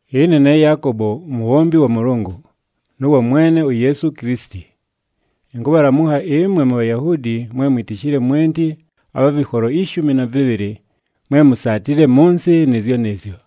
Ɨne ne Yaakobo, umubhombi wa Mʉlʉngʉ, nʉ wa Mwene uYeesu Kilisiti. Ɨnkʉbhalamʉkha ɨmwe muBhayahuudi mwe mwitishile mwenti abha vɨkholo ishumi na vɨbhɨlɨ, mwe musaatile mʉ nsɨ nɨɨzyo nɨɨzyo.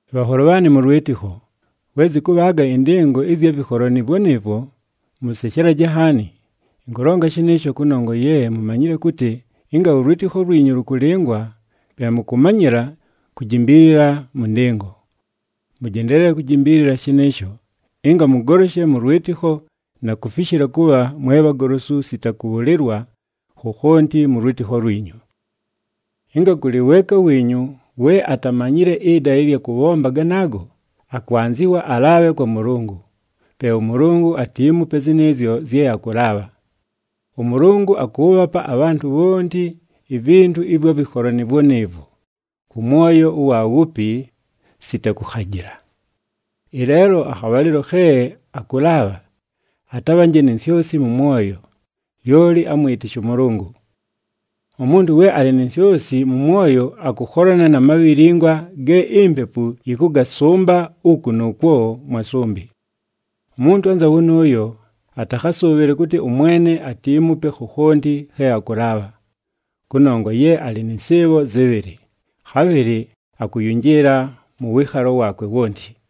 Bhanholo bhaanɨ mʉ lwɨtɨkho, we zɨkʉbhaaga ɨndɨngo ɨzya vɨkholo nɨɨvwo nɨɨvwo, mʉseshelaje nhaani. Ɨnkʉlonga shɨnɨɨsho kʉnongwa ye mumanyile kʉtɨ ɨnga ʉlwɨtɨkho lwinyu lʉkʉlɨngwa pe mʉkʉmanyɨla kujimbiilila mʉ ndɨngo. Mʉjendeelele kujimbiilila shɨnɨɨsho, ɨnga mʉgoloshe mʉ lwɨtɨkho na kufishila kʉbha mwe bhagolosu sita kʉbhʉlɨlwa khokhonti mʉ lwɨtɨkho lwinyu. Ɨnga kʉlɨ weeka wiinyu we atamanyile ɨdala ɨlya kʉbhomba ganaago, akwanzɨwa alaabhe kwa Mʉlʉngʉ, pe ʉMʉlʉngʉ atiimupe zɨnɨɨzyo zye akʉlaabha. ɄMʉlʉngʉ akʉʉbhapa abhantʉ bhonti ivintu ɨvwa vɨkholo nɨɨvwo nɨɨvwo kʉ mwoyo ʉwa wupi, sita kʉkhajɨla. Ɨleelo akhabhalɨlo khe akʉlaabha, atabhanje ni nsyosi mʉ mwoyo, lyoli amwɨtɨshe ʉMʉlʉngʉ. Umuntu we alɨ ni nsyosi mʉ mwoyo akʉkholana na mabhilingwa ge impepu yɨkʉgasʉmba uku nʉʉkwo mwa sʉmbɨ. Umuntu anza wʉnʉʉyo atakhasʉʉbhɨle kʉtɨ ʉMwene atiimupe khokhonti khe akʉlaabha, kʉnongwa ye alɨ nɨ nsɨɨbho zɨbhɨlɨ, khabhɨlɨ akʉyʉnjɨɨla mʉ wɨɨkhalo waakwe wonti.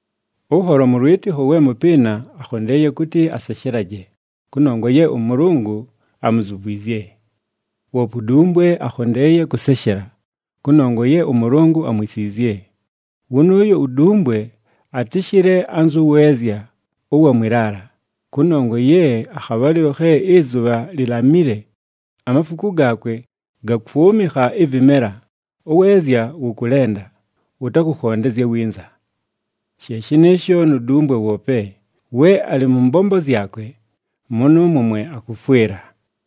Ʉnholo mʉ lwɨtɨkho we mʉpɨɨna akhondeeye kʉtɨ aseshelaje, kʉnongwa ye ʉMʉlʉngʉ amuzuvwizye. Woope udumbwe akhondeeye kʉseshela, kʉnongwa ye ʉMʉlʉngʉ amwisiizye. Wʉnʉʉyo udumbwe atɨshɨle anzʉ weezya ʉwa mwɨ laala, kʉnongwa ye akhabhalɨlo khe ɨzʉbha lilamile amafuku gaakwe gakwʉmɨkha ɨvɨmela, ʉweezya wʉkʉlenda, wʉtakʉkhondezya winza. She shɨnɨɨsho nu dumbwe woope, we alɨ mʉ mbombo zyakwe, mʉnʉʉmwo mwe akʉfwɨla.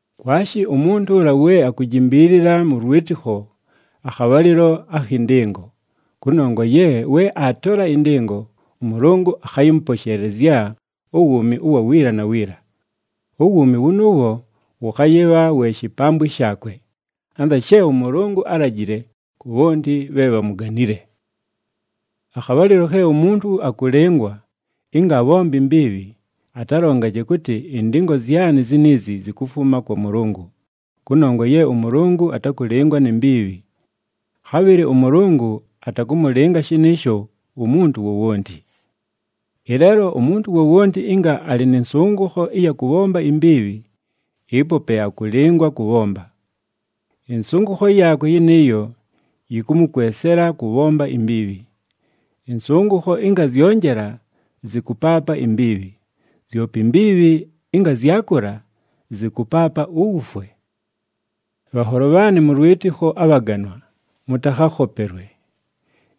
Kwashi umuntu ʉla we akujimbiilila mʉ lwɨtɨkho akhabhalɨlo akhɨ ndɨngo, kʉnongwa ye we aatola ɨndɨngo, ʉMʉlʉngʉ akhayɨmʉposheelezya uwuumi ʉwa wiila na wiila. Uwuumi wʉnʉʉwo wʉkhayɨbha we shipambwi shaakwe, anza she ʉMʉlʉngʉ álajile ku bhonti bhe bhamuganile. Akhabhalɨlo khe umuntu akʉlɨngwa ɨnga abhombe imbiibhi, atalongaje kʉtɨ, “Ɨndɨngo zyanɨ ziniizi zikufuma kwa Mʉlʉngʉ,” kʉnongwa ye ʉMʉlʉngʉ atakʉlɨngwa ni mbiibhi. Khabhɨlɨ ʉMʉlʉngʉ atakʉmʉlɨnga shɨnɨɨsho umuntu wowonti. Ɨleelo umuntu wowonti ɨnga alɨ nɨ nsʉngʉkho ɨya kʉbhomba imbiibhi, ɨpo pe akʉlɨngwa kʉbhomba. Ɨnsʉngʉkho yaakwe yɨnɨɨyo yɨkʉmʉkwesela kʉbhomba imbiibhi. Ɨnsʉngʉkho ɨnga zyonjela zɨkʉpaapa imbiibhi, zyope imbiibhi ɨnga zyakʉla zɨkʉpaapa uwufwe. Bhanholo bhaanɨ mʉ lwɨtɨkho abhaganwa, mʉtakhakhopelwe.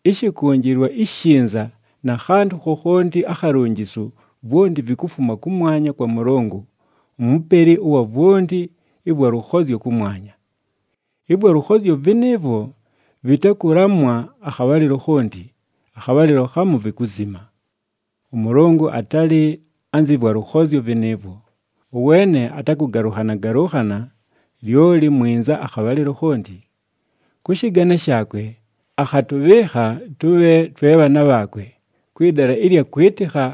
Ɨshɨkʉnjɨlwa ishinza na khantʉ khokhonti akhalunjisu vwonti vikufuma kʉmwanya kwa Mʉlʉngʉ, uMupeli ʉwa vwonti ɨvwa lʉkhozyo kʉmwanya. Ɨvwa lʉkhozyo vɨnɨɨvwo vɨtakʉlamwa akhabhalɨlo khonti, akhabhalɨlo khamu vikuzima. ɄMʉlʉngʉ atalɨ anzɨ vwa lʉkhozyo vɨnɨɨvwo, ʉweene atakʉgalʉnhana-galʉnhana, lyoli mwinza akhabhalɨlo khonti. Kʉ shɨgane shaakwe, akhatʉbhɨɨkha tʉbhe twe bhaana bhaakwe, kwɨ dala ɨlya kwɨtɨkha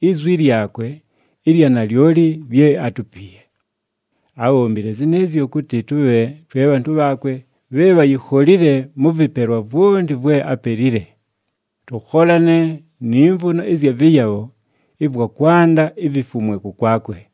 izwi lyakwe ɨlya nalyoli lye átupiiye. Ábhombile zɨnɨɨzyo kʉtɨ tʉbhe twe bhantʉ bhaakwe bhe bhayikholile mʉ vɨpelwa vwonti vwe apelile, tʉkholane ni mvuno ɨzya vɨyabho ɨvwa kwanda ivifumwe kʉkwakwe.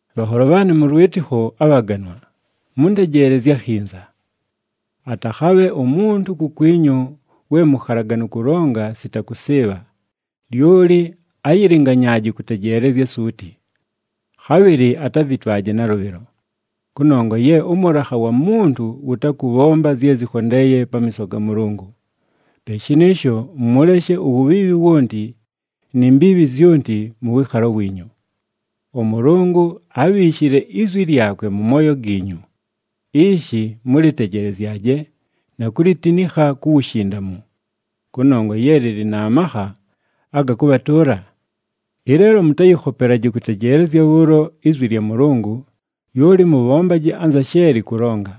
Bhanholo bhaanɨ mʉ lwɨtɨkho abhaganwa, mʉntejeelezye akhinza! Atakhabhe umuntu kukwinyu we mukhalaganu kʉlonga sita kʉsɨɨbha, lyoli ayilinganyaaje kʉtejeelezya suuti. Khabhɨlɨ atavitwaje nalʉbhɨlo, kʉnongwa ye ʉmʉlakha wa muntu wʉtakʉbhomba zye zɨkhondeeye pamiiso ga Mʉlʉngʉ. Pe shɨnɨɨsho, mʉleshe uwubhiibhi wonti ni mbiibhi zyonti mʉ wɨɨkhalo wiinyu. ɄMʉlʉngʉ ábhiishile izwi lyakwe mʉ mooyo giinyu, ishi mʉlɨtejelezyaje na kulitinikha ku wushindamu, kʉnongwa ye lɨlɨ na makha aga kʉbhatʉʉla. Ɨleelo mʉtayɨkhopelaje kʉtejeelezya bhʉʉlo izwi lya Mʉlʉngʉ, lyoli mʉbhombaje anza she lɨkʉlonga.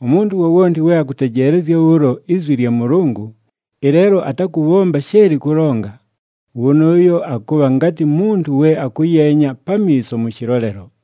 Umuntu wowonti we akʉtejeelezya bhʉʉlo izwi lya Mʉlʉngʉ, ɨleelo atakʉbhomba she lɨkʉlonga, wʉnʉʉyo akʉbha ngatɨ muntu we akʉyeenya pamiiso mʉ shɨlolelo.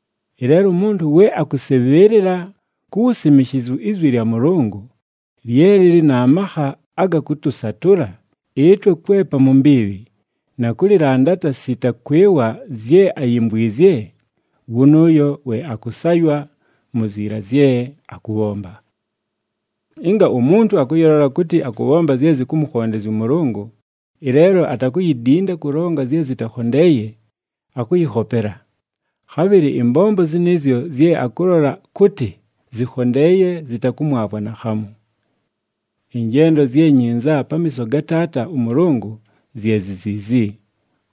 Ɨleelo umuntu we akʉsɨbhɨɨlɨla ku wusimishizu izwi lya Mʉlʉngʉ, lye lɨlɨ na makha aga kʉtʉsatʉla ɨtwe kwepa mu mbiibhi, na kʉlɨlandata sita kwɨwa zye ayimvwizye, wʉnʉʉyo we akʉsaywa mu ziila zye akʉbhomba. Ɨnga umuntu akʉyɨlola kʉtɨ akʉbhomba zye zɨkʉmʉkhondezya ʉMʉlʉngʉ, ɨleelo atakuyidinda kʉlonga zye zɨtakhondeeye, akʉyɨkhopela. Khabhɨlɨ ɨmbombo zɨnɨɨzyo zye akʉlola kʉtɨ zɨkhondeeye zɨtakʉmwavwa naakhamu. Ɨnjendo zye nyinza pamiiso ga Taata ʉMʉlʉngʉ zye zi ziizi,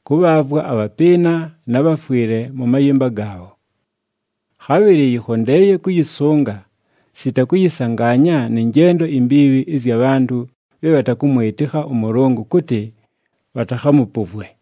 kʉbhaavwa abhapɨɨna na bhafwɨle mʉ mayɨmba gaabho. Khabhɨlɨ yɨkhondeeye kʉyɨsʉnga, sita kʉyɨsangaanya nɨ njendo imbiibhi ɨzya bhantʉ bhe bhatakʉmwɨtɨkha ʉMʉlʉngʉ, kʉtɨ bhatakhamʉpʉvwe.